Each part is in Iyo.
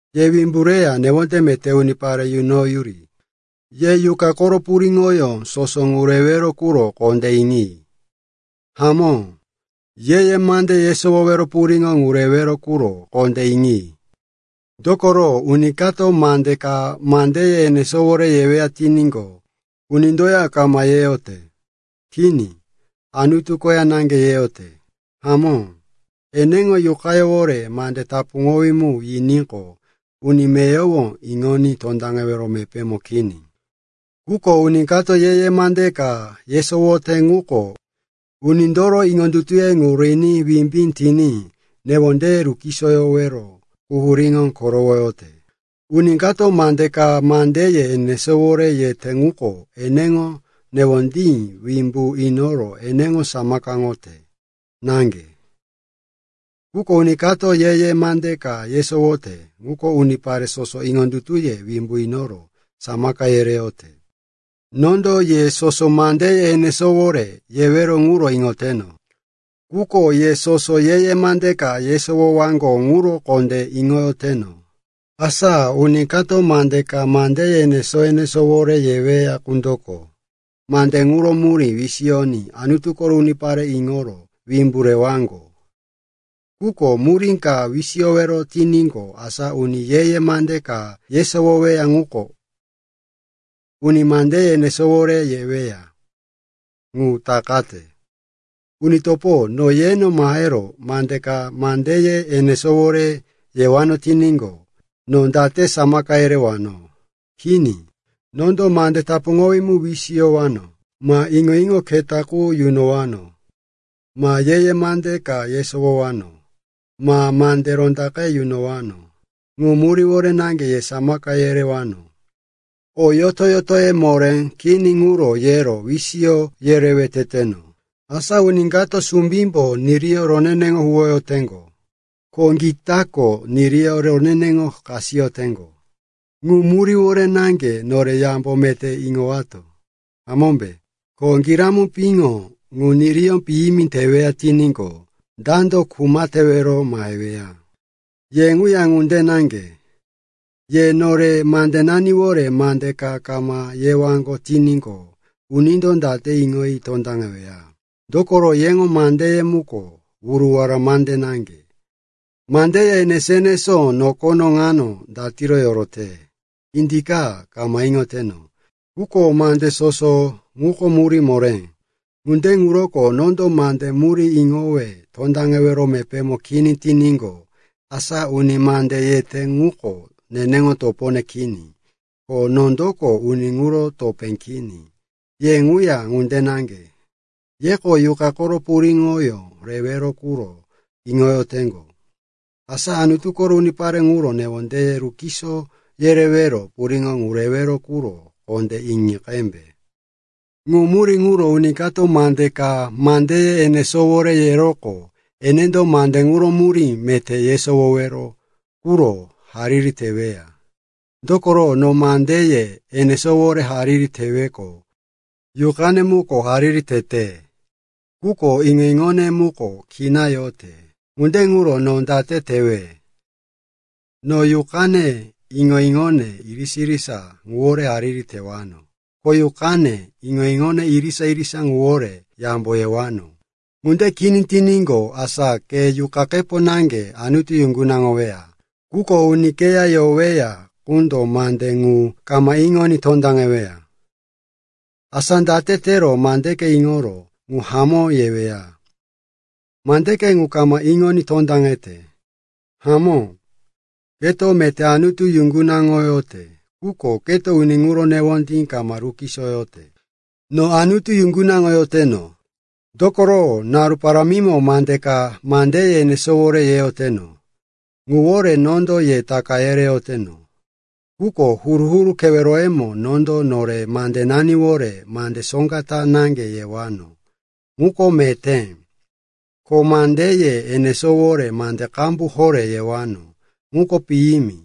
Ye wimbu reya newonde meté unipare yunoyuri. Ye Yuqa koro puriŋoyó soso ŋu rewero quro kondé iŋi. Hamó, ye-ye mande yesowowero puriŋo ŋu rewero quro kondé iŋi. Dokoro, uni kato mande ka mandeye enesówore yeweya tiníqo, unindoya kama yeyote. Kini, Anutu koya naŋge yeyote. Hamó, eneŋo yuqayówore mande tapuŋowí mu yiníqo, uni meyowo iŋoní tondaŋewero mepémo kini. Quko uni kato ye-ye mande ka yesowote ŋuko unindoro iŋondutuye ŋu riní wimbí tiní, newondeye rukisoyoro, quhuríye korowoyote. Uni kato mande ka mandeye enesówore yete ŋuko eneŋo newondí wimbu inoro eneŋo samakaŋoyote naŋge. Quko uni kato ye-ye mande ka yesowote ŋuko unipare soso iŋondutuye wimbu inoro samaka yereyote. Nondo ye soso mandeye enesówore yewero ŋuro iŋoteno, quko ye soso ye-ye mande ka yesowowaŋgo ŋuro kondé iŋoyoteno. Asa uni kato mande ka mandeye enesó-enesówore yeweya qundoko mande ŋuro murí wisiyoní Anutu koro unipare iŋoro wimbu rewaŋgo. Quko murí kama wisiyoweya tiníqo, asa uni ye-ye mande ka yesowoweya ŋuko uni mandeye enesówore yeweya ŋu takayote. Uni topo, no yeno mahero mande ka mandeye enesówore yewano tiníqo, no date samaka yerewano? Kini, nondo mande tapuŋowí mu wisiyowano, ma iŋo-iŋo keta qu yunowano, ma ye-ye mande ka yesowowano, ma mande rondaqe yunowano. Ŋu muríwore naŋge ye samaka yerewano. O yoto-yotoye moré kini ŋuro yero wisiyo yerewe teteno. Asa uni kato sumbímbo niriyó roneneŋo huwoyoteŋgo, ko gitako niriyó roneneŋo kasiyoteŋgo. Ŋu muríwore naŋge nore yambo meté iŋowato, hamómbe? Ko giramu piŋo ŋu niriyó piyimi teweya tiníqo, dando kuma tewero maheweya? Ye ŋuya ŋunde naŋge. Ye nore mandenaniwore mande ka kama yewaŋgo tiníqo, unindo date iŋoyi tondaŋeweya? Dokoro yeŋo mandeye muko wuruwara mande naŋge. Mandeye enesó-enesó nokono ŋano datiro yorote, indika, kama iŋoteno. Quko mande soso ŋuko murí moré. Ŋunde ŋuroko nondo mande murí iŋowe tondaŋewero mepémo kini tiníqo, asa uni mande yete ŋuko neneŋo topone kini, ko nondoko uni ŋuro topé kini. Ye ŋuya ŋunde naŋge. Yeko Yuqa koro puriŋoyó rewero quro iŋoyoteŋgo. Asa Anutu koro unipare ŋuro newondeye rukiso yerewero puriŋo ŋu rewero quro kondé iŋi qembe. Ŋu murí ŋuro uni kato mande ka mandeye enesówore yeroqo, enendo mande ŋuro murí meté yesowowero quro hariri teweya. Dokoro no mandeye enesówore hariri teweqo, yuqane muko hariri tete, quko iŋo-iŋone muko kina yote. Ŋunde ŋuro no date tewe? No yuqane, iŋo-iŋone irisa-irisa ŋuwore hariri tewano. Ko yuqane, iŋo-iŋone irisa-irisa ŋuwore yambo yewano. Ŋunde kini tiníqo, asa ke yuqakepo naŋge Anutu yuŋgunaŋoweya, quko uni keya yoweya qundo mande ŋu kama iŋoní tondaŋeweya. Asa date tero mandeke iŋoro, “Ŋu hamó,” yeweya? Mandeke ŋu kama iŋoní tondaŋete. Hamó, keto meté Anutu yuŋgunaŋoyote, quko keto uni ŋuro newondí kama rukisoyote. No Anutu yuŋgunaŋoyoteno, dokoro naru parámimo mande ka mandeye enesówore yeyoteno. Ŋuwore nondo ye taka yereyoteno. Quko huru-huru keweroyemo nondo nore mandenaniwore mande soŋga ta naŋge yewano, ŋuko meté, ko mandeye enesówore mande qambu horé yewano, ŋuko piyimi.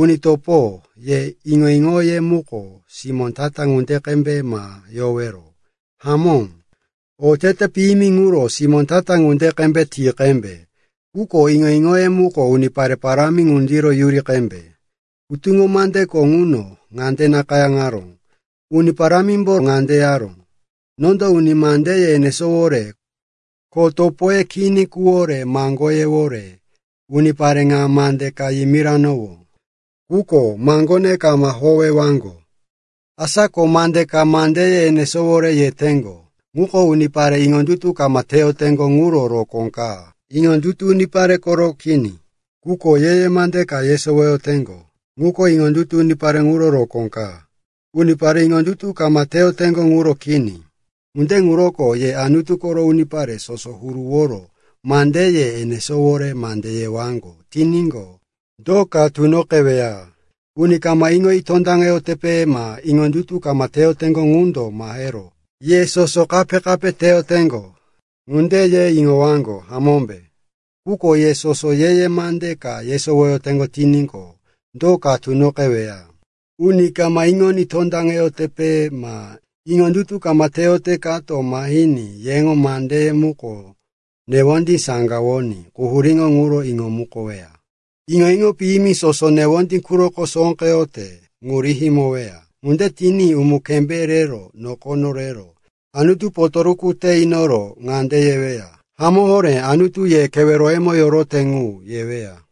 Uni topo, ye iŋo-iŋoye muko simó ta-ta ŋunde qembe ma yowero. Hamó, otete piyimi ŋuro simó ta-ta ŋunde qembe ti qembe. Quko iŋo-iŋoye muko unipare parámi ŋundiro yuri qembe. Hutuŋo mandeko ŋuno ŋande nakayáŋaró, “Uni Parámimbo ŋande yaró, ‘Nondo uni mandeye enesówore, ko topoye kini quro maŋgoyewore unipare ŋa mande ka yimirowano. Quko maŋgone kama howewaŋgo.’” Asa ko mande ka mandeye enesówore yeteŋgo ŋuko unipare iŋondutu kama teyoteŋgo ŋuro rokó ka, iŋondutu unipare koro kini. Quko ye-ye mande ka yesowoyoteŋgo ŋuko iŋondutu unipare ŋuro rokó ka, unipare iŋondutu kama teyoteŋgo ŋuro kini. Ŋunde ŋuroko ye Anutu koro unipare soso huruworo mandeye enesówore mande yewaŋgo tiníqo, do ka tunoqeweya? Uni kama iŋoyi tondaŋeyotepe ma iŋondutu kama teyoteŋgo ŋundo mahero, ye soso kape-kape teyoteŋgo, ŋunde ye iŋowaŋgo, hamómbe? Quko ye soso ye-ye mande ka yesowoyoteŋgo tiníqo, do ka tunoqeweya? Uni kama iŋoní tondaŋeyotepe ma iŋondutu kama teyote kato mahiní yeŋo mandeye muko newondí saŋgawoní quhuríŋo ŋuro iŋomukoweya. Iŋo-iŋo piyimi soso newondí quroko sóqeyote ŋu rihimoweya. Ŋunde tiní umu-kembé rero nokono rero Anutu potoruku te inoro ŋande yeweya, “Hamó horé Anutu ye keweroyemo yorote ŋu,” yeweya.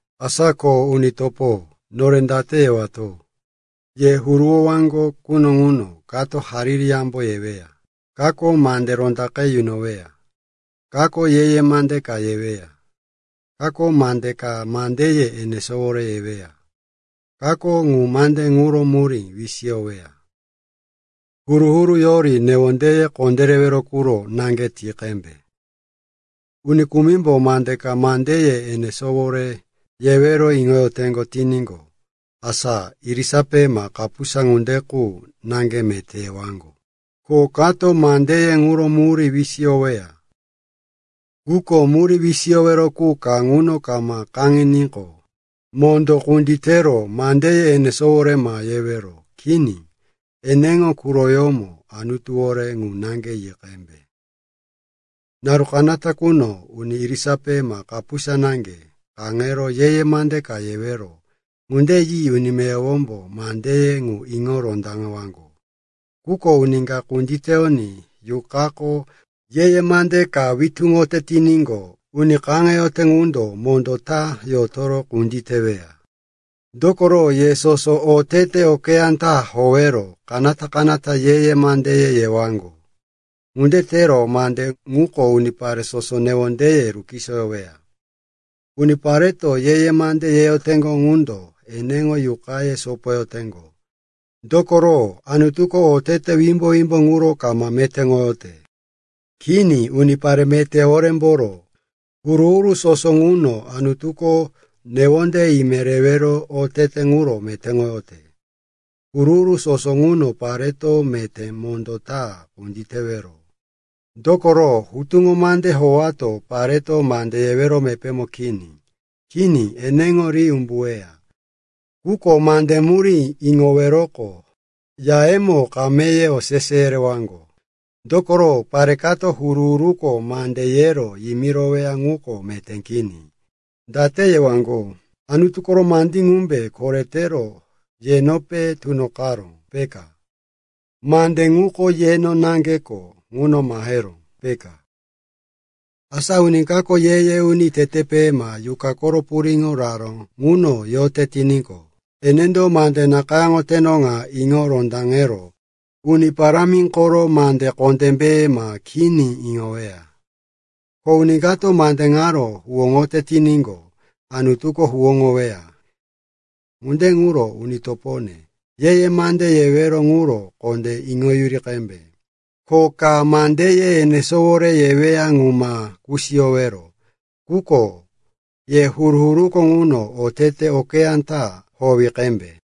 Asa ko, uni topo, nore date yewato? Ye huruwowaŋgo quno ŋuno kako hariri yambo yeweya, kako mande rondaqe yunoweya, kako ye-ye mande ka yeweya, kako mande ka mandeye enesówore yeweya, kako ŋu mande ŋuro murí wisiyoweya. Huru-huru yori newondeye kondérewero quro naŋge ti qembe. Uni kumimbo mande ka mandeye enesówore yewero iŋoyoteŋgo tiníqo, asa irisape ma kapusa ŋunde qu naŋge meté yewaŋgo. Ko kato mandeye ŋuro murí wisiyoweya. Quko murí wisiyowero qu ka ŋuno kama kaŋiníqo, mondó kunditero mandeye enesówore ma yewero. Kini, eneŋo quroyómo Anutuwore ŋu naŋge yi qembe. Naru kanata quno uni irisape ma kapusa naŋge kaŋero ye-ye mande ka yewero. Ŋunde yi uni meyowombo mandeye ŋu iŋo rondaŋewaŋgo. Quko uni ka kunditeyoní Yuqako ye-ye mande ka witúŋote tiníqo, uni kaŋe yeyote qundo mondó ta yotoro kunditeweya. Dokoro ye soso otete okeyá ta howero kanata-kanata ye-ye mandeye yewaŋgo. Ŋunde tero mande ŋuko unipare soso newondeye rukisoyoweya. Unipareto ye-ye mande yeyoteŋgo ŋundo eneŋo yuqaye sopoyoteŋgo. Dokoro Anutuko otete wimbo-wimbo ŋuro kama metéŋoyote. Kini, unipare meté horémboro huru-huru soso ŋuno Anutuko newonde ime rewero otete ŋuro metéŋoyote. Huru-huru soso ŋuno pareto meté mondó ta kunditewero. Dokoro Hutuŋo Mande howato pareto mande yewero mepémo kini. Kini, eneŋo ri umbuweya. Quko mande murí iŋoweroqo, yayemo kameye osese yerewaŋgo. Dokoro pare kato huru-huruko mande yero yimiroweya ŋuko meté kini. Date yewaŋgo? Anutu koro mandí ŋumbe koretero yenope tunoqaró, peka? Mande ŋuko yeno naŋgeko ŋuno maheró, peka? Asa uni kako ye-ye uni tetepe ma Yuqa koro puriŋo raró ŋuno yote tiníqo, enendo mande nakayáŋoteno ŋa iŋo rondaŋero Uni Parámi koro mande kondémbe ma kini iŋoweya. Ko uni kato mande ŋaro huwóŋoyote tiníqo, Anutuko huwóŋoweya. Ŋunde ŋuro, uni topone, ye-ye mande yewero ŋuro kondé iŋoyuri qembe, ko ka mandeye enesówore yeweya ŋu ma kusiyowero. Quko ye huru-huruko ŋuno otete okeyá ta howi qembe.